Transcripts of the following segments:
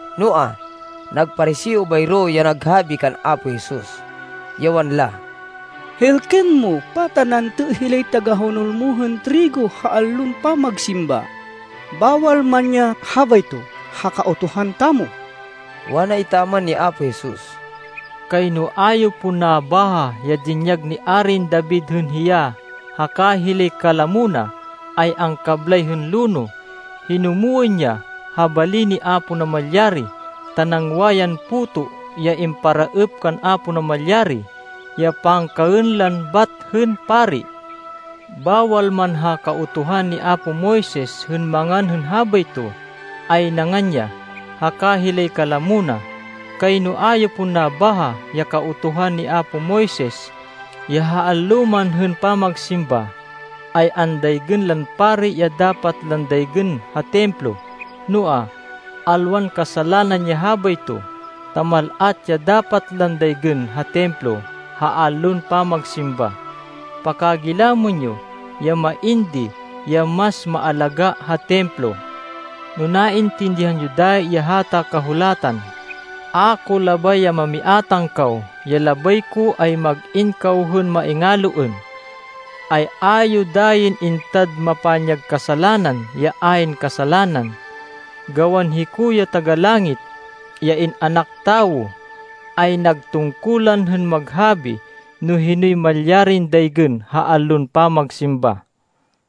Noa, nag Pariseo bayro ya naghabi kan Apo Jesus, ya wanla, “Hêlkên mo! Pata nantê hilay tagahonol mo hên trigo ha allon pamagsimba, bawal man ya habayto ha Kautuhan tamo?” Wana etaman ni Apo Jesus, “Kayno a yo pon nabaha ya dinyag ni Arin David hên hiya haka hilay kalamo na, ay angkablay hên lonoh. Hinumwên ya ha bali ni Apo Namalyari, ta nangwa yan puto ya imparaêp kan Apo Namalyari ya pangkaên lan bat hên pari. Bawal man ha Kautuhan ni apo Moises hên mangan hên habayto, ay nangan ya, haka hilay kalamo na. Kayno a yo pon nabaha ya Kautuhan ni apo Moises, ya ha allo man hên pamagsimba, ay andaygên lan pari ya dapat lan daygên ha Templo. Noa, alwan kasalanan ya habayto, ta mal-at ya dapat lan daygên ha Templo ha allon pamagsimba. Pakagilamên yo, ya main di ya mas maalagá ha Templo. No naintindihan yo dayi ya hata Kahulatan, ‘A ko labay ya mamiátang kaw. Ya labay ko ay mag-in kaw hên maingaloên,’ ay a yo dayin intad mapanyag kasalanan, ya ayn kasalanan. Gawan hiko ya Taga-Langit, ya In-anak Tawo, ay nag tungkulan hên maghabi no hinoy malyarin daygên ha allon pamagsimba.”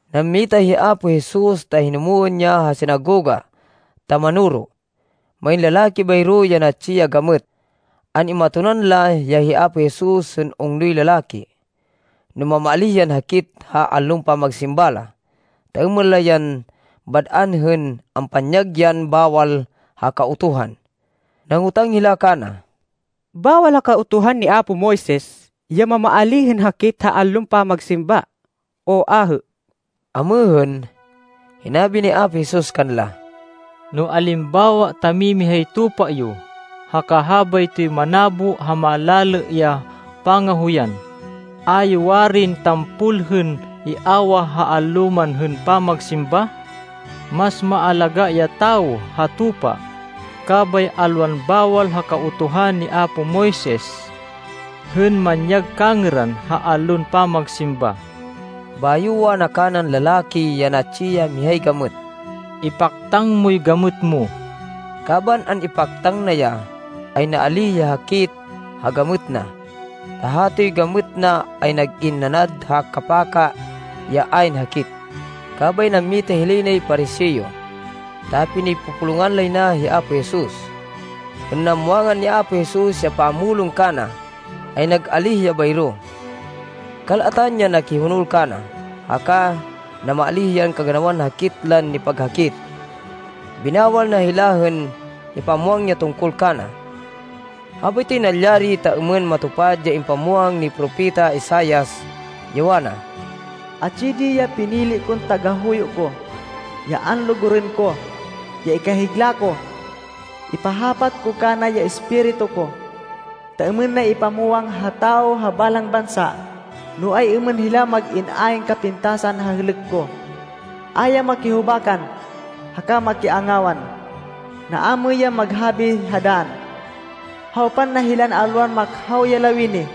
Nammita hi Apo Jesus ta hinumwên ya ha sinagoga ta manoro. Main lalaki bayro ya natsi ya gamêt. An-imatonan la ya hi Apo Jesus hên ungnoy lalaki, no mamaalíh yan hakit ha allon pamagsimba la, ta êmên la yan bad-an hên ampanyag yan bawal ha Kautuhan. Nangotang hila kana, “Bawal ha Kautuhan ni apo Moises ya mamaalíh hên hakit ha allon pamagsimba, o ahê?” Amêhên, hinabi ni Apo Jesus kanla, “No alimbawa ta mimihay tupa yo, haka habaytoy manabo ha malalê ya pangahoyan, a yo ya warin tampol hên iawah allo man hên pamagsimba? Mas maalagá ya tawo ha tupa! Kabay alwan bawal ha Kautuhan ni apo Moises hên manyag kangêran ha allon pamagsimba.” Bayo wana kanan lalaki ya natsi ya mihay gamêt, “Ipaktang moy gamêt mo.” Kaban an-ipaktang na ya, ay naalíh ya hakit ha gamêt na, ta hatoy gamêt na ay nag-in nanad ha kapaka ya ayn hakit. Kabay nammita hilay nay Pariseo, ta pinipupulungan lay na hi Apo Jesus. Hên namwangan ni Apo Jesus ya pamulong kana, ay nag-alíh ya bayro. Kal-atan ya nakihonol kana, haka namaalíh yan kaganawan hakit lan nipaghakit. Binawal na hila hên ipamwang ya tungkol kana. Habaytoy nalyari ta êmên matupad ya impamwang ni Propeta Isaias, ya wana, “Atsi di ya pinili kon tagahuyo ko, ya anlugurên ko, ya ikahigla ko. Ipahapat ko kana ya Espiritu ko, ta êmên na ipamwang ha tawo ha balang bansa, no ay-êmên hila mag-in ayn kapintasan ha hêlêk ko. A ya makihubakan, haka makiangawan. Naamêy yan mag-habi ha dann. Hawpan na hilay alwan makhaw ya lawini,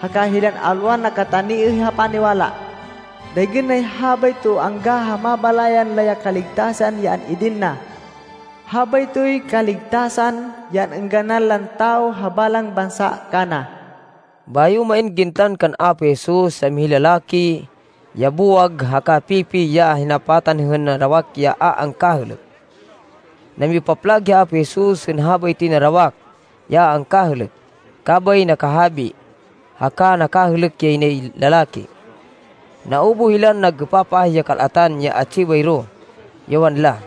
haka hilay alwan nakataniêh ha paniwala. Daygên nay habayto angga ha mabalayan la ya kaligtasan ya an-idin na. Habaytoy kaligtasan ya an-êngganan lan tawo ha balang bansa kana.” Bayo main gintan kan Apo Jesus ya mihay lalaki ya buwag haka pipi ya hinapatan hên narawak ya a angkahêlêk. Namipaplag hi Apo Jesus hên habaytoy narawak ya a angkahêlêk, kabay nakahabi, haka nakahêlêk yay nay lalaki. Naubuh hilan nag-êpapah ya kal-atan ya atsi bayro, ya wanla,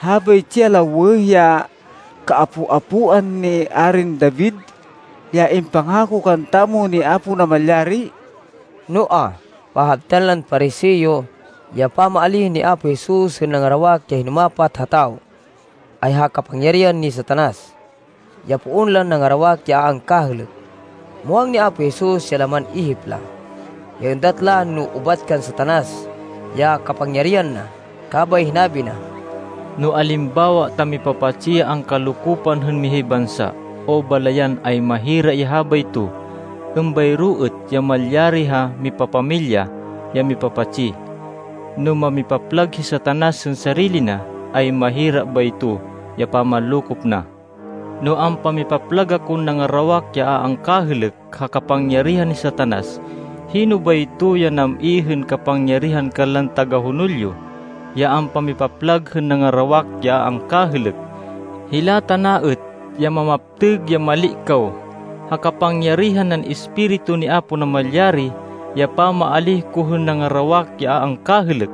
“Habaytsi ya lawêh ya kaapo-apoan ni Arin David ya impangako kantamo ni Apo Namalyari!” Noa, pahabtan lan Pariseo, ya pamaalíh ni Apo Jesus hên nangarawak ya hinumapat ha tawo, ay ha kapangyarihan ni Satanas, ya poon lan nangarawak ya a angkahêlêk. Muwang ni Apo Jesus ya laman ihip la, ya êndat la no ubat kan Satanas ya kapangyarihan na. Kabay hinabi na, “No alimbawa ta mipapatsi ya angkalokopan hên mihay bansa, o balayan ay mahira ya habayto. Êmbayro êt ya malyari ha mipapamilya ya mipapatsi. No mamipaplag hi Satanas hên sarili na, ay mahira bayto ya pamanlokop na. No ampamipaplag akon nangarawak ya a angkahêlêk ha kapangyarihan ni Satanas, hino bayto ya nam-i hên kapangyarihan kanlan tagahonol yo, ya ampamipaplag hên nangarawak ya a angkahêlêk? Hila tana êt ya mamaptêg ya mali kaw. Ha kapangyarihan nan Espiritu ni Apo Namalyari ya pamaalíh ko hên nangarawak ya a angkahêlêk.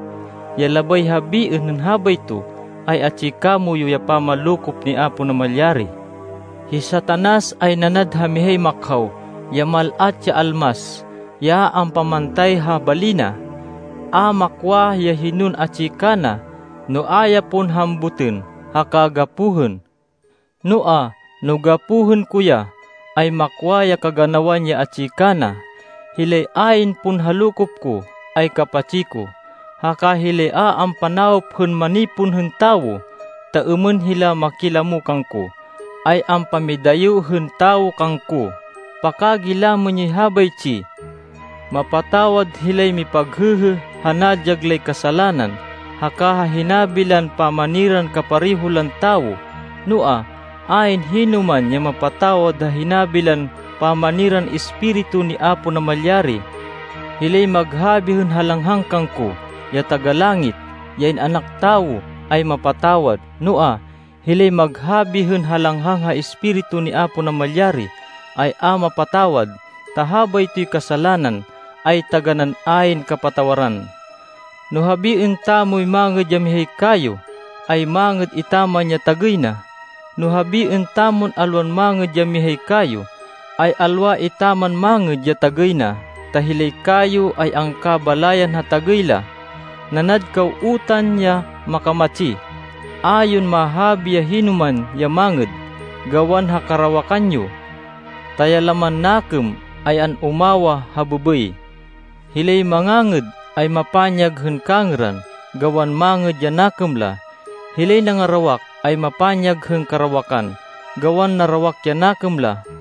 Ya labay habiên hên habayto, ay atsi kamoyu ya pamanlokop ni Apo Namalyari. “Hi Satanas ay nanad ha mihay makhaw, ya mal-at ya almas, ya ampamantay ha bali na. A makwa, ya hinon atsi kana, no a ya pon hambutên, haka gapohên. Noa, no gapohên ko ya, ay makwa ya kaganawan ya atsi kana. “Hilay ayn pon ha lokop ko, ay kapatsi ko. Haka hilay a ampanawop hên manipon hên tawo, ta êmên hila makilamo kangko, ay ampamidayo hên tawo kangko. Pakagilamên yoy habaytsi. Mapatawad hilay mipaghêhê ha nadyag lay kasalanan, haka ha hinabi lan pamaniran kapareho lan tawo, noa, ayn hinoman ya mapatawad ha hinabi lan pamaniran Espiritu ni Apo Namalyari. Hilay maghabi hên halanghang kangko, ya Taga-Langit, ya In-anak Tawo, ay mapatawad. Noa, hilay maghabi hên halanghang ha Espiritu ni Apo Namalyari, ay a mapatawad. Ta habaytoy kasalanan, ay taganán ayn kapatawaran.” “No habiên tamoy mangêd ya mihay kayo, ay mangêd etaman ya tagêy na. No habiên tamon alwan mangêd ya mihay kayo, ay alwa etaman mangêd ya tagêy na. Ta hilay kayo ay angkabalayan ha tagêy la. Nanad kaw utan ya makamatsi! A yon mahabi ya hinoman ya mangêd, gawan ha karawakan yo! Ta ya laman nakêm ay an-umawah ha bêbêy. Hilay mangangêd ay mapanyag hên kangêran, gawan mangêd ya nakêm la. Hilay nangarawak ay mapanyag hên karawakan, gawan narawak ya nakêm la.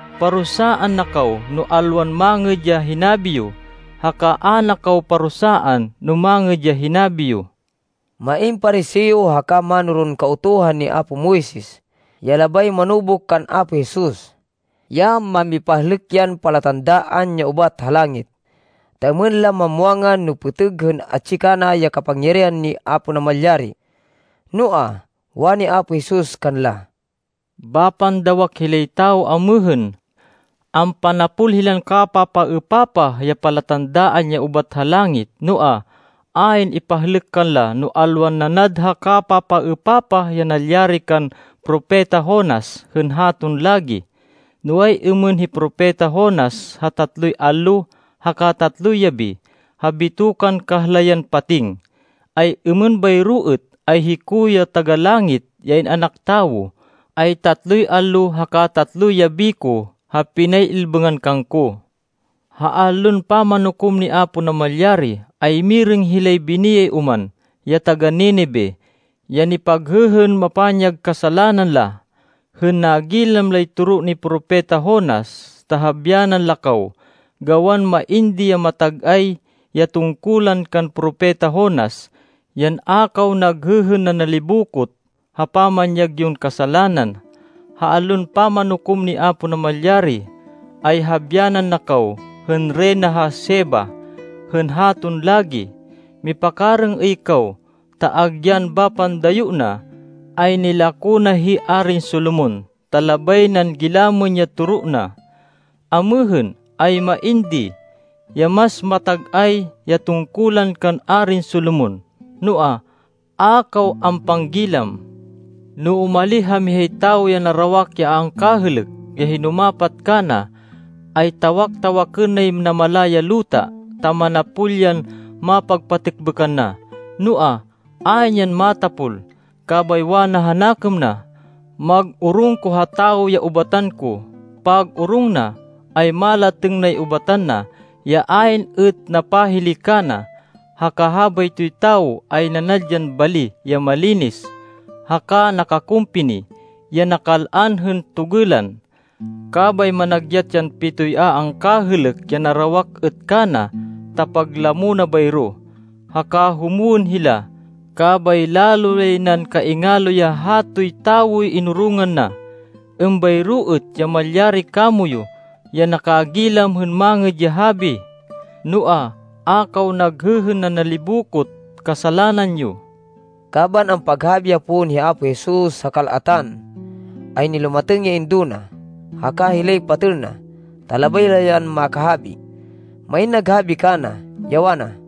Parusaan na kaw no alwan mangêd ya hinabi yo, haka a na kaw parusaan no mangêd ya hinabi yo.” Main Pariseo haka mánoron Kautuhan ni apo Moises ya labay manubuk kan Apo Jesus, ya mamipahlêk yan palatandaan ya ubat ha langit, ta êmên la mamwangan no pêtêg hên atsi kana ya kapangyarihan ni Apo Namalyari. Noa, wani Apo Jesus kanla, “Bapan dawak hilay tawo amêhên. Ampanapol hilan kapapaêpapah ya palatandaan ya ubat ha langit. Noa, ayn ipahlêk kanla, no alwan nanad ha kapapaêpapah ya nalyari kan Propeta Jonas hên haton lagi. No ay-êmên hi Propeta Jonas ha tatloy allo haka tatloy yabi, ha bitokan kahlayan pating, ay êmên bayro êt, ay hiko, ya Taga-Langit, ya In-anak Tawo, ay tatloy allo haka tatloy yabi ko ha pinay-ilbêngan kangko. Ha Allon Pamanukom ni Apo Namalyari, ay mirêng hilay biniyay oman, ya taga-Ninive, ya nipaghêhên pamanyag kasalanan la, hên nagilam lay toro ni Propeta Jonas, ta habyanan la kaw, gawan main di ya matag-ay ya tungkulan kan Propeta Jonas, yan a kaw naghêhên nanalibokot ha pamanyag yon kasalanan. Ha Allon Pamanukom ni Apo Namalyari, ay habyanan na kaw hên Reyna ha Sheba hên haton lagi. Mipakarêng-êy kaw, ta agyan bapan dayo na, ay nilako na hi Arin Solomon, ta labay nan gilamên ya toro na. Amêhên, ay main di, ya mas matag-ay ya tungkulan kan Arin Solomon, noa, a kaw ampanggilam. “No umalih ha mihay tawo ya narawak ya a angkahêlêk, ya hinumapat kana, ay tawak-tawakên nay namala ya luta, ta manapol yan mapagpatêkbêkan na. Noa, ayn yan matapol. Kabay wana ha nakêm na, ‘Mag-orong ko ha tawo ya ubatan ko.’ Pag-orong na, ay malatêng nay ubatan na, ya ayn êt napahili kana, haka habaytoy tawo ay nanad yan bali ya malinis, haka nakakumpini, ya nakal-an hên togêlan. Kabay managyat yan pitoy a angkahêlêk ya narawak êt kana, ta paglamo na bayro. Haka humwên hila, kabay lalo yay nan kaingalo ya hatoy tawoy inorongan na. Êmbayro êt ya malyari kamoyu ya nakagilam hên Mangêd ya Habi, noa, a kaw naghêhên nanalibokot kasalanan yo.” Kaban ampaghabi ya pon hi Apo Jesus ha kal-atan, ay nilumatêng ya indo na, haka hilay patêl na, ta labay la yan makahabi. Main naghabi kana, ya wana,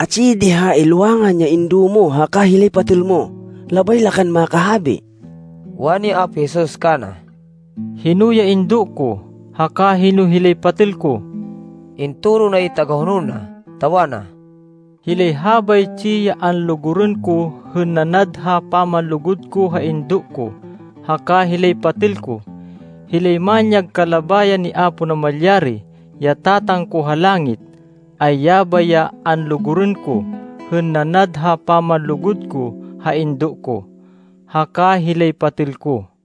“Atsi di ha ilwangan ya indo mo haka hilay patêl mo. Labay la kan makahabi.” Wani Apo Jesus kana, “Hino ya indo ko, haka hino hilay patêl ko?” Intoro nay tagahonol na, ta wana, “Hilay habaytsi ya anlugurên ko hên nanad ha pamanlugud ko ha indo ko, haka hilay patêl ko. Hilay manyag kalabayan ni Apo Namalyari, ya Tatang ko ha langit, ay yabay ya anlugurên ko hên nanad ha pamanlugud ko ha indo ko, haka hilay patêl ko.”